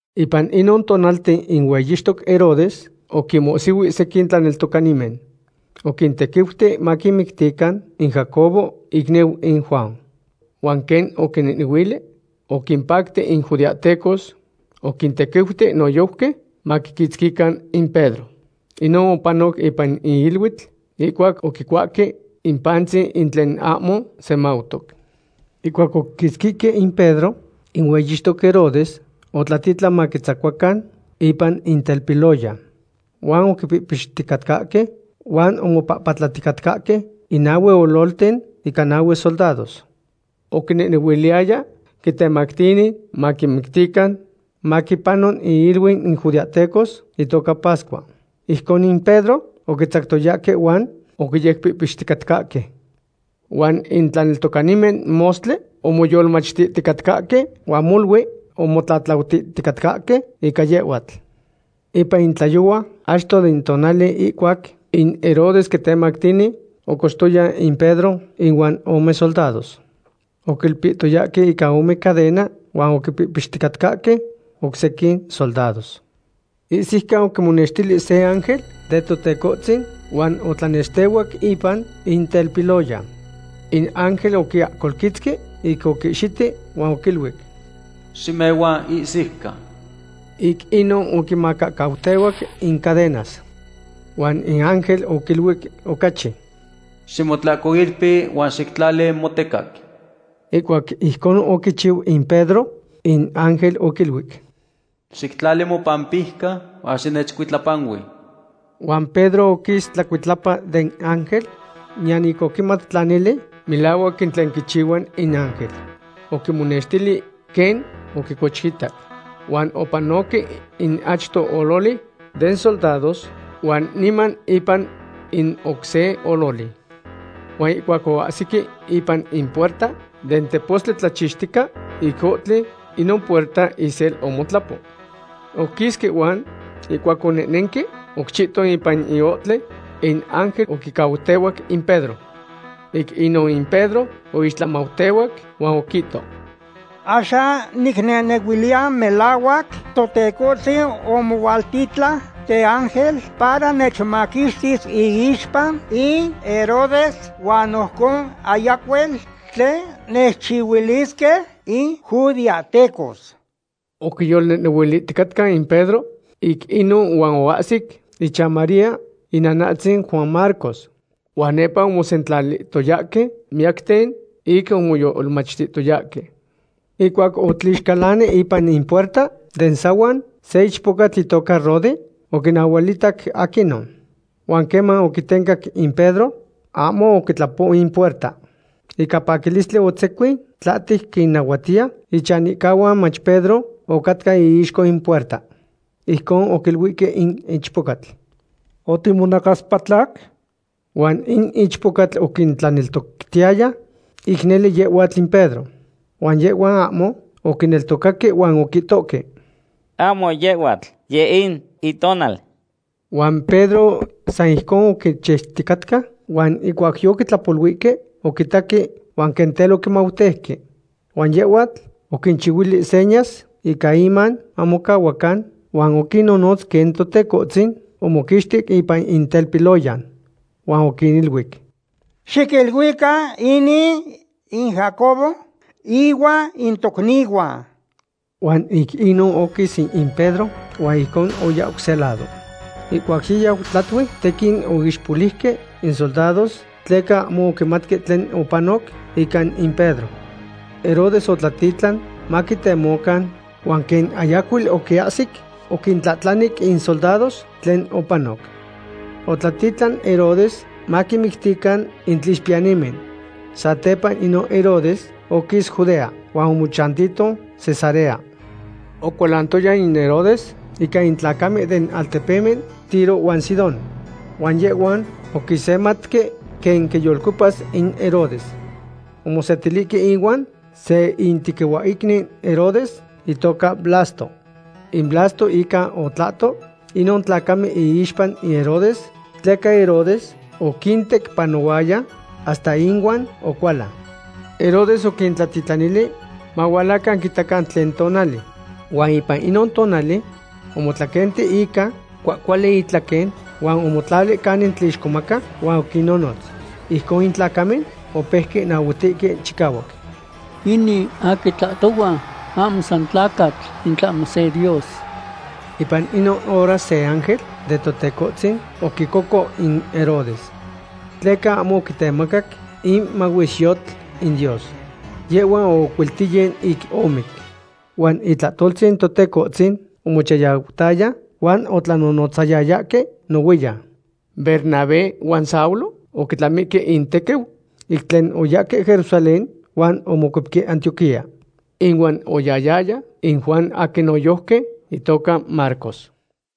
Ipan inon tonalten in hueyixtoc Herodes oquinmohsihui sequin tlaneltocanimen. Oquintequiuti maquimictican in Jacobo, icniu in Juan. Huan quen oquinehnehuili oquimpacti in judeahtecos, oquintequiuti noyojqui maquiquitzquican in Pedro. Inon opanoc ipan in iluitl ihcuac oquicuahque in pantzin in tlen ahmo semautoc. Ihcuac oquiquitzquihque in Pedro, in hueyixtoc Herodes otlatitlan maquitzacuacan ipan in telpiloyan. Huan oquipihpixticatcahque huan omopapatlaticatcahque in nahue ololten ica nanahue soldados. Oquinehnehuiliyaya quitemactini maquimictican maquipano iiluiu in judeahtecos itoca pascua. Ijcon in Pedro oquitzactoyahque huan oquiyecpihpixticatcahque. Huan in tlaneltocanimen mostli omoyolmachtihticatcahque huan molui omotlatlautihticatcahque ica yehhuatl. Ipan in tlayohua achto den tonali ihcuac in Herodes quitemactini, ocochtoya in Pedro inuan ome soldados. Oquilpihtoyahque ica ome cadena huan oquipihpixtihticatcahque oc sequin soldados. Ihsiucan oquimonextili se ángel den Totecohtzin huan otlanextehuac ipan in telpiloyan. In ángel oquiahcolquitzqui ic oquihxiti huan oquiluic: ―Ximehua ihsiucan. Ic inon oquimacahcautehuac in cadenas. Huan in ángel oquiluic ocachi: ―Ximotlahcoilpi huan xictlali motecac. Ihcuac ijcon oquichiu in Pedro, in ángel oquiluic: ―Xictlali mopampijca huan xinechcuitlapanui. Huan Pedro oquis tlacuitlapa den ángel, niyan ic oquimat tla nele melahuac in tlen quichihua in ángel. Oquimonenextili quen oquicochitac. Huan opanoque in achto ololi den soldados huan niman ipan in oc se ololi. Huan ihcuac oahsihque ipan in puerta den tepostli tlachixtica ic ohtli, inon puerta isel omotlapo. Oquisque huan ihcuac onehnenque oc chihton ipan in ohtli, in ángel oquicautehuac in Pedro. Ic inon in Pedro oixtlamautehuac huan oquihto: ―Axan nicnehnehuiliya melahuac Totecohtzin omohualtitlan teángel para nechmaquixtis iixpa in Herodes huan ojcon ayacuel tlen nechchihuilisque in judeahtecos. Oquiyolnehnehuilihticatca in Pedro ic inon huan oahsic ichan María, inanatzin Juan Marcos. Huan nepa omosentlalihtoyahque miyacten ic omoyolmachtihtoyahque. Ihcuac otlixcalani ipan in puerta den sahuan, se ichpocatl itoca Rode oquinahualitac aquinon. Huan queman oquitencac in Pedro, ahmo oquitlapo in puerta. Ica paquilistli otzecuin tlahtec quinnahuatiya ichanihcahuan mach Pedro ocatca iixco in puerta. Ijcon oquiluihque in ichpocatl: ―¡Otimonacaspatlac! Huan in ichpocatl oquintlaneltoctiyaya ic nele yehhuatl in Pedro. Huan yehhuan ahmo oquineltocaque huan oquihtohque: ―Ahmo yehhuatl; yeh in itonal. Huan Pedro san ijcon oquichiuticatca huan ihcuac yoquitlapoluihque, oquitaque huan quen tel oquimauteuque. Huan yehhuatl oquinchihuili senyas ica iman mamocahuacan, huan oquinnonotz quen Totecohtzin omoquixtic ipan in telpiloyan. Huan oquiniluic: ―Xiquiluican inin in Jacobo ihuan in tocnihuan. Huan ic inon oquis in Pedro huan ijcon oya oc se lado. Ihcuac yiyau tlatui, tequin oixpoliuque in soldados tleca ahmo oquimatque tlen opanoc ica in Pedro. Herodes otlatitlan maquitemocan huan quen ayacuel oquiahsic, oquintlahtlanic in soldados tlen opanoc. Otlatitlan Herodes maquinmictican in tlixpiyanimen. Satepa inon Herodes oquis Judea huan omochantihto Cesarea. Ocualantoya in Herodes ica in tlacamen den altepemen Tiro huan Sidón. Huan yehhuan oquisematque quen quiyolcuepas in Herodes. Omosetilihque ihuan se itequihuahicniu Herodes itoca Blasto. In Blasto inca otlahto inon tlacamen iixpa in Herodes, tleca Herodes oquintecpanohuaya hasta inuan ocualan. Herodes oquintlatitlanili mahualacan quimatican tlen tonali. Huan ipan inon tonali omotlaquenti ica cuahcuali itlaquen huan omotlali canin tlixcomaca huan oquinnonotz. Ijcon in tlacamen opeuque nahuatihque chicahuac: ―¡Inin aquin tlahtohua ahmo san tlacatl, in tlahmo se dios! Ipan inon hora se ángel den Totecohtzin oquicoco in Herodes. Tleca ahmo oquitemacac in mahuesyotl in Dios. Yehhua oocuilteyin ic omic. Huan itlahtoltzin Totecohtzin omochayautaya huan otlanonotzayayahque nohuiyan. Bernabé huan Saulo oquitlamihque intequiu ic tlen oyahque Jerusalén huan omocuepque Antioquía. Inuan oyahyaya in Juan aquin noyojqui itoca Marcos.